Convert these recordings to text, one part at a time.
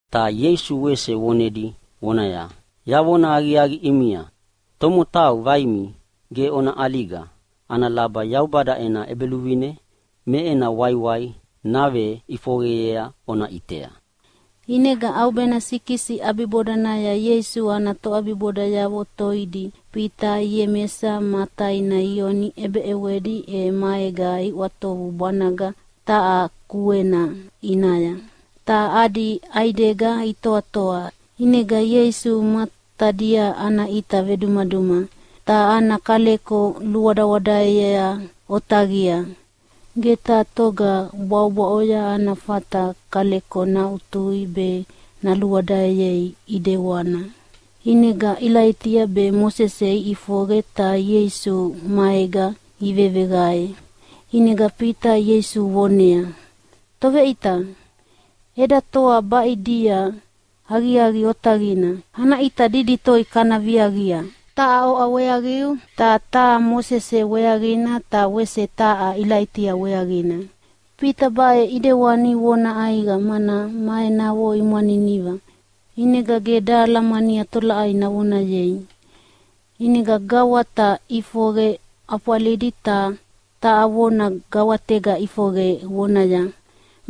Ta Ieisu wese vonedi vonaya, “Yavona aqiaqi ʼimia, tomotau vaimi ge ona ʼaliga ana laba Yaubada ena ʼEbeluvine me ena waiwai naveʼifoqeyea ona ʼitea.” ʼInega ʼaubena sikisi ʼabibodanaya Ieisu ana toʼabibodayavo toidi Fita be Iemesa ma taina Ioni ʼebeʼewedi e maega iʼwatovu bwanaga taha kuena ʼinaya, ta adi ʼaidega itoatoa. ʼInega Ieisu matadia ana ʼita vedumaduma. Ta ana kaleko luwadawadaea otaqia. Ge taha toga bwaʼobwaʼoya ana fata kaleko naʼutui be naluwadaeyei ʼidewana. ʼInega Ilaitia be Mosese iʼifoqe ta Ieisu maega iveveqae. ʼInega Fita Ieisu voneaya, “Toveʼita, eda toa baʼidia aqiaqi otaqina, ana ʼita didi toi kana viaqia. Taha oʼa weaqiu, ta taha Mosese weaqina ta wese taha Ilaitia weaqina.” (Fita baʼe ʼidewani vona ʼaiqa, mana ma enavo imwaniniva, ʼinega ge dahalamania tolaʼai navonayei.) ʼInega gawata ʼifoqe ʼafwalidi ta taha vona gawatega ʼifoqe vonaya,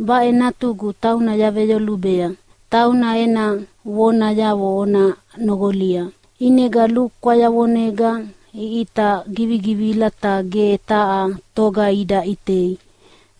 “Baʼe Natugu, tauna yaveyolubea. Tauna ena vonayavo ona noqolia!” ʼInega lukwayavonega iʼita givigivila ta ge taha toga ida ʼitei,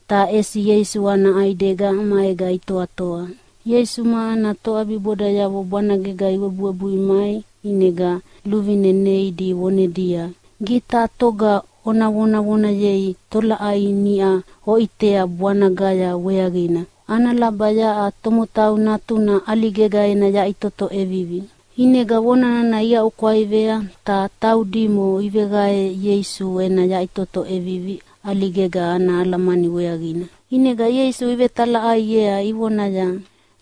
ta ʼesi Ieisu ana ʼaidega maega itoatoa. Ieisu ma ana toʼabibodayavo bwanagega iwebuwebui mai ʼinega luvine neidi vonedia, “Ge taha toga ona vonevonei tolaʼai niʼa oʼitea bwanagaya weaqina, ana laba yaʼa Tomotau Natuna ʼaligega ena yaʼitoto ʼevivi.” ʼInega vona nana iaʼukwaivea, ta taudimo iveqae Ieisu ena yaʼitoto ʼevivi ʼaligega ana alamani weaqina. ʼInega Ieisu ivetalaʼaiea ivonaya,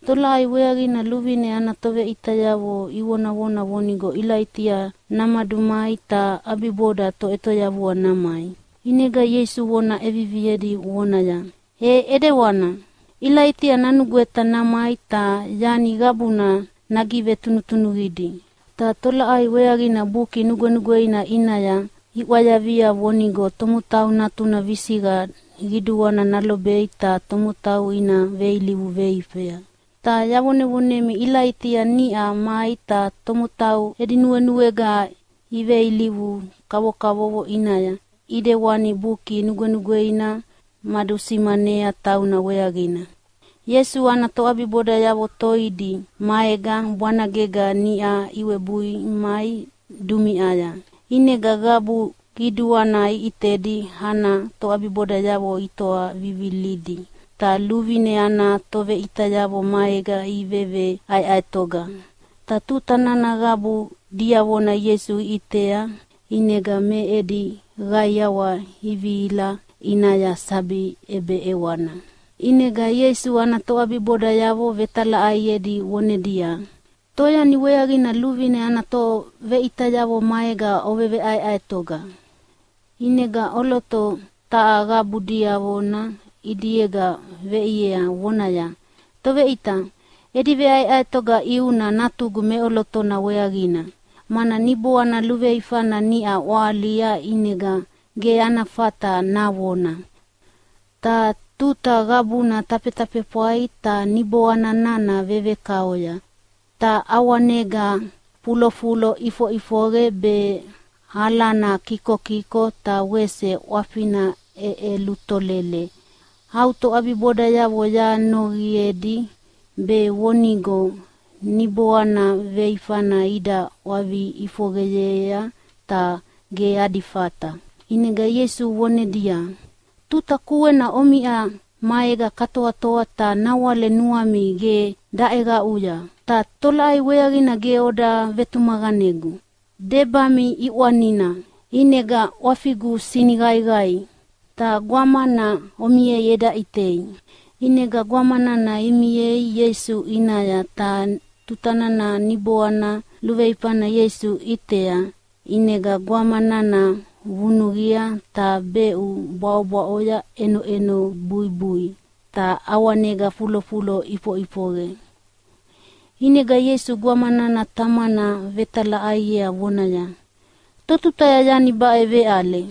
“Tolaʼai weaqina luvine ana toveʼitayavo ivonavona vonigo Ilaitia namadumai ta ʼabiboda Toʼetoyavua namai?” ʼInega Ieisu vona ʼeviviedi vonaya, “E ʼidewana, Ilaitia nanugweta namai ta yani qabuna nagivetunuqidi. Ta tolaʼai weaqina Buki Nugwenugweina ʼinaya iʼwayavia vonigo Tomotau Natuna visiqa qiduana nalobei ta tomotau ina veilivu veifea? Ta yavonevonemi, Ilaitia niʼa mai ta tomotau edi nuenuega iveilivu kavokavovo ʼinaya, ʼidewana Buki Nugwenugweina madusimanea tauna weaqina.” Ieisu ana toʼabiboda toidi maega bwanagega niʼa iwebui mai dumiʼaya, ʼinega qabu qiduana ʼitedi ana toʼabibodayavo itoa vivilidi, ta luvine ana toveʼitayavo maega iveveʼaeʼaetoga. Ta tuta nana qabu diavona Ieisu iʼitea ʼinega me edi qaiawa ivihila ʼinaya sabi ʼebeʼewana. ʼInega Ieisu ana toʼabibodayavo vetalaʼaiedi vonedia, “Toyani weaqina luvine ana toveʼitayavo maega oveveʼaeʼaetoga?” ʼInega ʼoloto taha qabu diavona ʼidiega veʼia voneaya, “Toveʼita, edi veʼaeʼaetoga ʼiuna natugu meʼolotona weaqina, mana niboana luveifana niʼa ʼwahalia ʼinega ge ana fata navona. Ta tuta qabuna tafetafefwai ta niboana nana vevekaoya. Ta ʼawanega fulofulo ʼifoʼifoqe be alana kikokiko ta wese ʼwafina ʼeʼelutolele. Au toʼabibodayavo yanoqiedi be vonigo niboana veifana ida ʼwavi ʼifoqeyea, ta ge adi fata.” ʼInega Ieisu vonedia, “Tuta kuena omiʼa maega katoatoa ta nawale nuami ge daʼeqaʼuya, ta tolaʼai weaqina ge oda vetumaqanegu? Debami ʼiʼwanina, ʼinegana ʼwafigu siniqaiqai. Ta gwamana omiei eda ʼitei!” ʼInega gwama nana imiea Ieisu ʼinaya. Ta tuta nana niboana luveifana Ieisu ʼitea, ʼinega gwama nana vunuqia ta beʼu bwaʼobwaʼoya ʼenoʼeno buibui ta ʼawanega fulofulo ʼifoʼifoqe. ʼInega Ieisu gwama nana tamana vetalaʼaiea vonaya, “Totutaya yani baʼe veʼale?”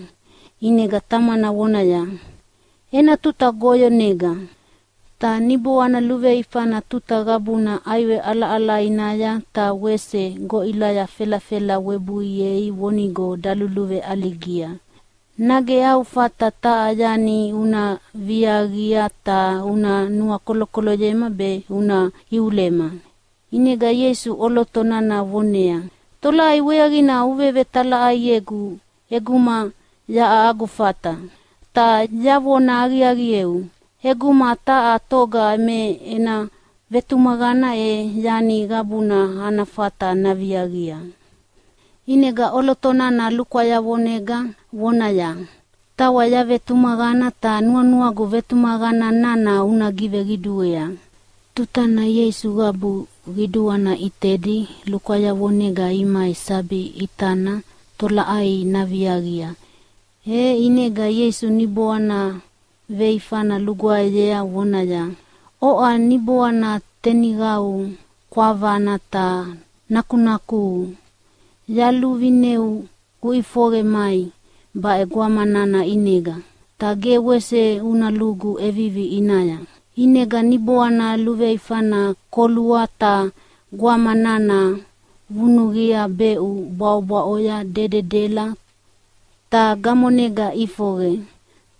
ʼInega tamana vonaya, “Ena tuta goyonega. Ta niboana luveifana tuta qabuna ʼaiwe ʼalaʼalainaya ta wese goʼilaya felafela webuiei vonigo daluluveʼaligia. Nage au fata taha yani una viaqia ta una nuakolokoloyema be una iulema?” ʼInega Ieisu ʼoloto nana voneaya, “Tolaʼai weaqina uvevetalaʼaiegu ʼeguma yaʼa agu fata? Ta yavona aqiaqieu, ʼeguma taha toga me ena vetumaqana e yani qabuna ana fata naviaqia.” ʼInega ʼoloto nana lukwayavonega vonaya, “Tawa yavetumaqana, ta nuanuagu vetumaqana nana una giveqiduea.” Tutana Ieisu qabu qiduana ʼitedi lukwayavonega imai sabi ʼitana tolaʼai naviaqia, e ʼinega Ieisu niboana veifana lugwaeyea vonaya, “Oʼa niboana teniqau kwavana ta nakunakuhu, yaluvineu uʼifoqe mai baʼe gwama nana ʼinega, ta ge wese una lugu ʼevivi ʼinaya!” ʼInega niboana luveifana kolua ta gwama nana vunuqia beʼu bwaʼobwaʼoya dededela, ta gamonega ʼifoqe.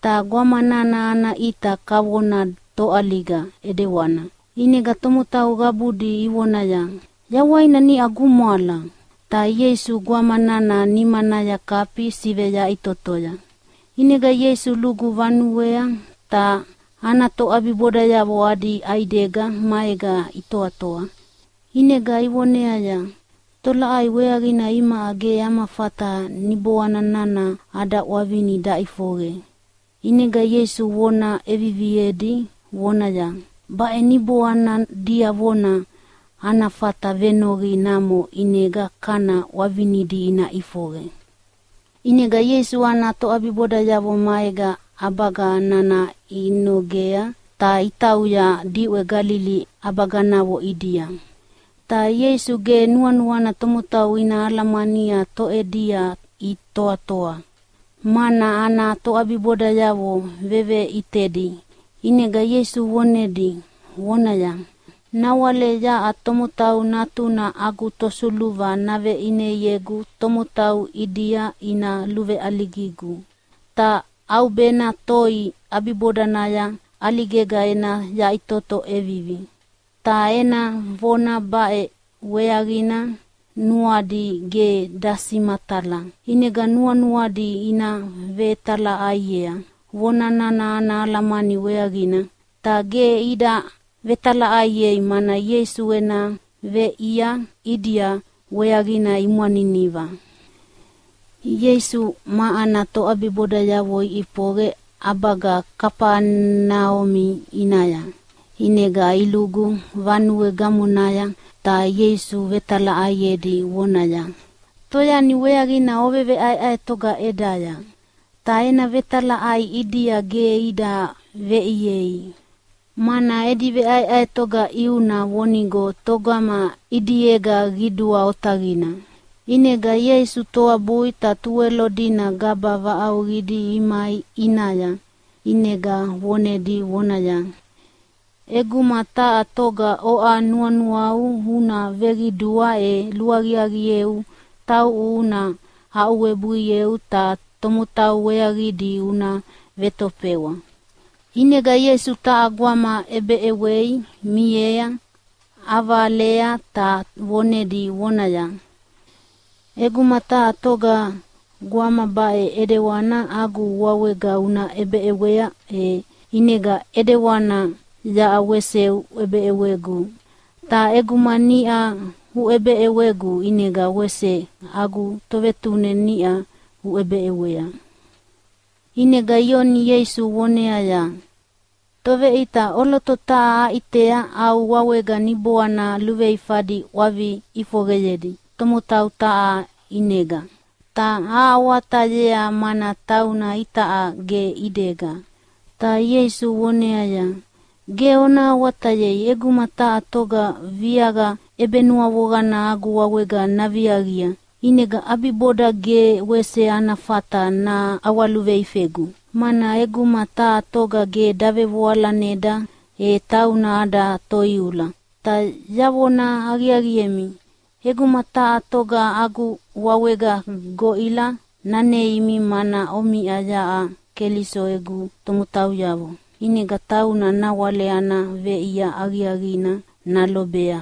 Ta gwama nana ana ʼita kavona toʼaliga ʼidewana. ʼInega tomotau qabudi ivonaya, “Yawaina niʼa gumwala.” Ta Ieisu gwama nana nimanaya kafi siveyaʼitotoya. ʼInega Ieisu lugu vanuea, ta ana toʼabibodayavo adi ʼaidega maega itoatoa. ʼInega ivoneaya, “Tolaʼai weaqina imaʼa ge ama fata niboana nana ada ʼwavini daʼifoqe?” ʼInega Ieisu vona ʼeviviedi vonaya, “Baʼe niboana diavona ana fata venoqi namo ʼinega kana ʼwavinidi ina ʼifoqe.” ʼInega Ieisu ana toʼabibodayavo maega ʼabaga nana inogea ta itauya diʼwe Galili ʼabaganavo ʼidia. Ta Ieisu ge nuanuana tomotau ina alamania toʼedia itoatoa, mana ana toʼabibodayavo veveʼitedi. ʼInega Ieisu vonedi vonaya, “Nawale yaʼa Tomotau Natuna agu tosuluva naveʼineiegu tomotau ʼidia ina luveʼaligigu, ta ʼaubena toi ʼabibodanaya ʼaligega ena yaʼitoto ʼevivi.” Ta ena vona baʼe weaqina nuadi ge dasimatala. ʼInega nuanuadi ina vetalaʼaiea vona nana ana alamani weaqina. Ta ge ida vetalaʼaiei, mana Ieisu ena veʼia ʼidia weaqina imwaniniva. Ieisu ma ana toʼabibodayavo iʼifoqe ʼabaga Kafaneumi ʼinaya, ʼinega ilugu vanue gamonaya, ta Ieisu vetalaʼaiedi vonaya, “Toyani weaqina oveʼaeʼaetoga ʼedaya?” Ta ena vetalaʼai ʼidia ge ida veʼiei, mana edi veʼaeʼaetoga ʼiuna vonigo togama ʼidiega qidua otaqina. ʼInega Ieisu toabui ta Tuwelo dina gaba vaʼauqidi imai ʼinaya. ʼInega vonedi vonaya, “ʼEguma taha toga oʼa nuanuau una veqidua e luaqiaqieu tauʼu una aʼuwebuieu ta tomotau weaqidi una vetofewa.” ʼInega Ieisu taha gwama ʼebeʼewei miea ʼavalea ta vonedi vonaya, “ʼEguma taha toga gwama baʼe ʼidewana agu wawega una ʼebeʼewea, e ʼinega ʼidewana yaʼa wese uʼebeʼewegu. Ta ʼeguma niʼa uʼebeʼewegu ʼinega wese agu Tovetune niʼa uʼebeʼewea.” ʼInega Ioni Ieisu voneaya, “Toveʼita, ʼoloto taha aʼitea au wawega niboana luveifadi ʼwavi ʼifoqeyedi tomotau taha ʼinega. Ta ahawatayea mana tauna itaʼa ge ʼidega.” Ta Ieisu voneaya, “Ge ona awatayei! ʼEguma taha toga viaqa ʼebenuavoqana agu wawega naviaqia, ʼinega ʼabiboda ge wese ana fata naʼawaluveifegu. Mana ʼeguma taha toga ge davevoalaneda e tauna ada toiula. Ta yavona aqiaqiemi, ʼeguma taha toga agu wawega goʼila naneimi mana omiʼa yaʼa Keliso egu tomotauyavo, ʼinega tauna nawale ana veʼia aqiaqina nalobea.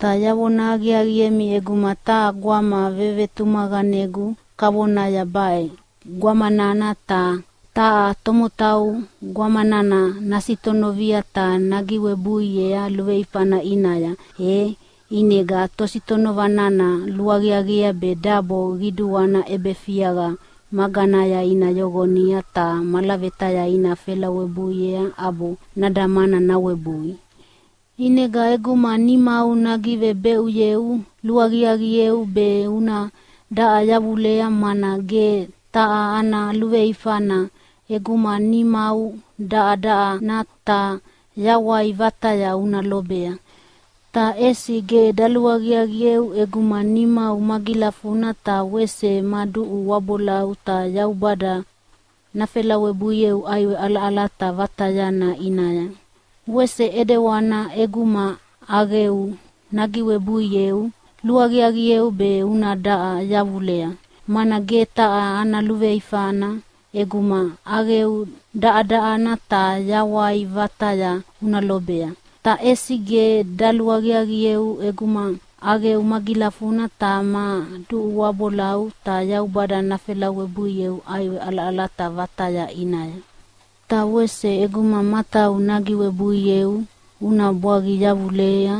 “Ta yavona aqiaqiemi, ʼeguma taha gwama vevetumaqanegu kavona baʼe gwama nana, ta taha tomotau gwama nana nasitonovia ta nagivebeʼuyea luveifana ʼinaya, e ʼinega tositonova nana luaqiaqiea be dabo qiduana ʼebefiaqa maganaya ina yoqonia ta malavetaya ina felawebuiea ʼabo nadamana nawebui. ʼInega ʼeguma nimau nagivebeʼuyeu luaqiaqieu be una daʼa yavulea. Mana ge taha ana luveifana ʼeguma nimau daʼadaʼana ta yawai vataya una lobea. Ta ʼesi ge daluaqiaqieu ʼeguma nimau magilafuna ta wese ma duʼu wabolau ta Yaubada nafelawebuieu ʼaiwe ʼalaʼalata vatayana ʼinaya. Wese ʼidewana ʼeguma ʼaqeu nagivebeʼuyeu, luaqiaqieu be una daʼa yavulea. Mana ge taha ana luveifana ʼeguma ʼaqeu daʼadaʼana ta yawai vataya una lobea. Ta ʼesi ge daluaqiaqieu ʼeguma ʼaqeu magilafuna ta ma duʼu wabolau ta Yaubada nafelawebuieu ʼaiwe ʼalaʼalata vatayana ʼinaya. Ta wese ʼeguma matau nagivebeʼuyeu una bwaqi yavulea,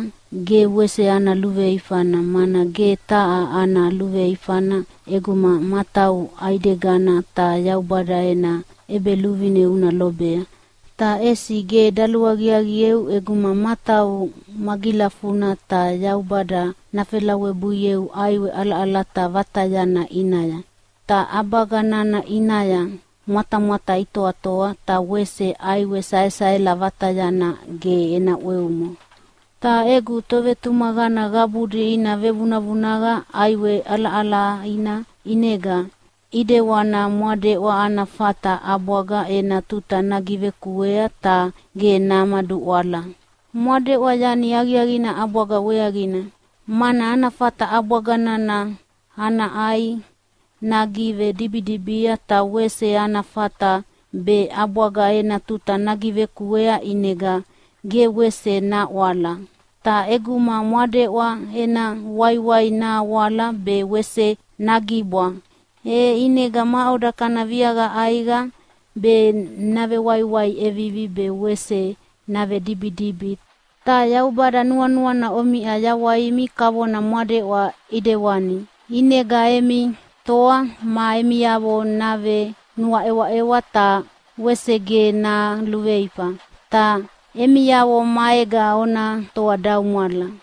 ge wese ana luveifana. Mana ge taha ana luveifana ʼeguma matau ʼaidegana ta Yaubada ena ʼEbeluvine una lobea. Ta ʼesi ge daluaqiaqieu ʼeguma matau magilafuna ta Yaubada nafelawebuieu ʼaiwe ʼalaʼalata vatayana ʼinaya. ‘Ta ʼabaga nana ʼinaya mwatamwata itoatoa ta wese ʼaiwe saesaela vatayana ge ena ʼweumo.’ Ta egu tovetumaqana qabudi ina vevunavunaqa ʼaiwe ʼalaʼalaina ʼinega, ʼidewana mwadeʼwa ana fata ʼabwaga ena tuta nagivekuea ta ge namaduʼwala. Mwadeʼwa yani aqiaqina ʼabwaga weaqina, mana ana fata ʼabwaga nana ana ʼai nagivedibidibia ta wese ana fata be ʼabwaga ena tuta nagivekuea ʼinega ge wese naʼwala. Ta ʼeguma mwadeʼwa ena waiwai nahawala be wese nagibwa, e ʼinega maʼoda kana viaqa ʼaiqa be navewaiwai ʼevivi be wese navedibidibi? Ta Yaubada nuanuana omiʼa yawaimi kavona mwadeʼwa ʼidewani, ʼinega emi toa ma emiavo navenuaʼewaʼewa, ta wese ge naluveifa. “Ta emiavo maega ona toadaumwala.”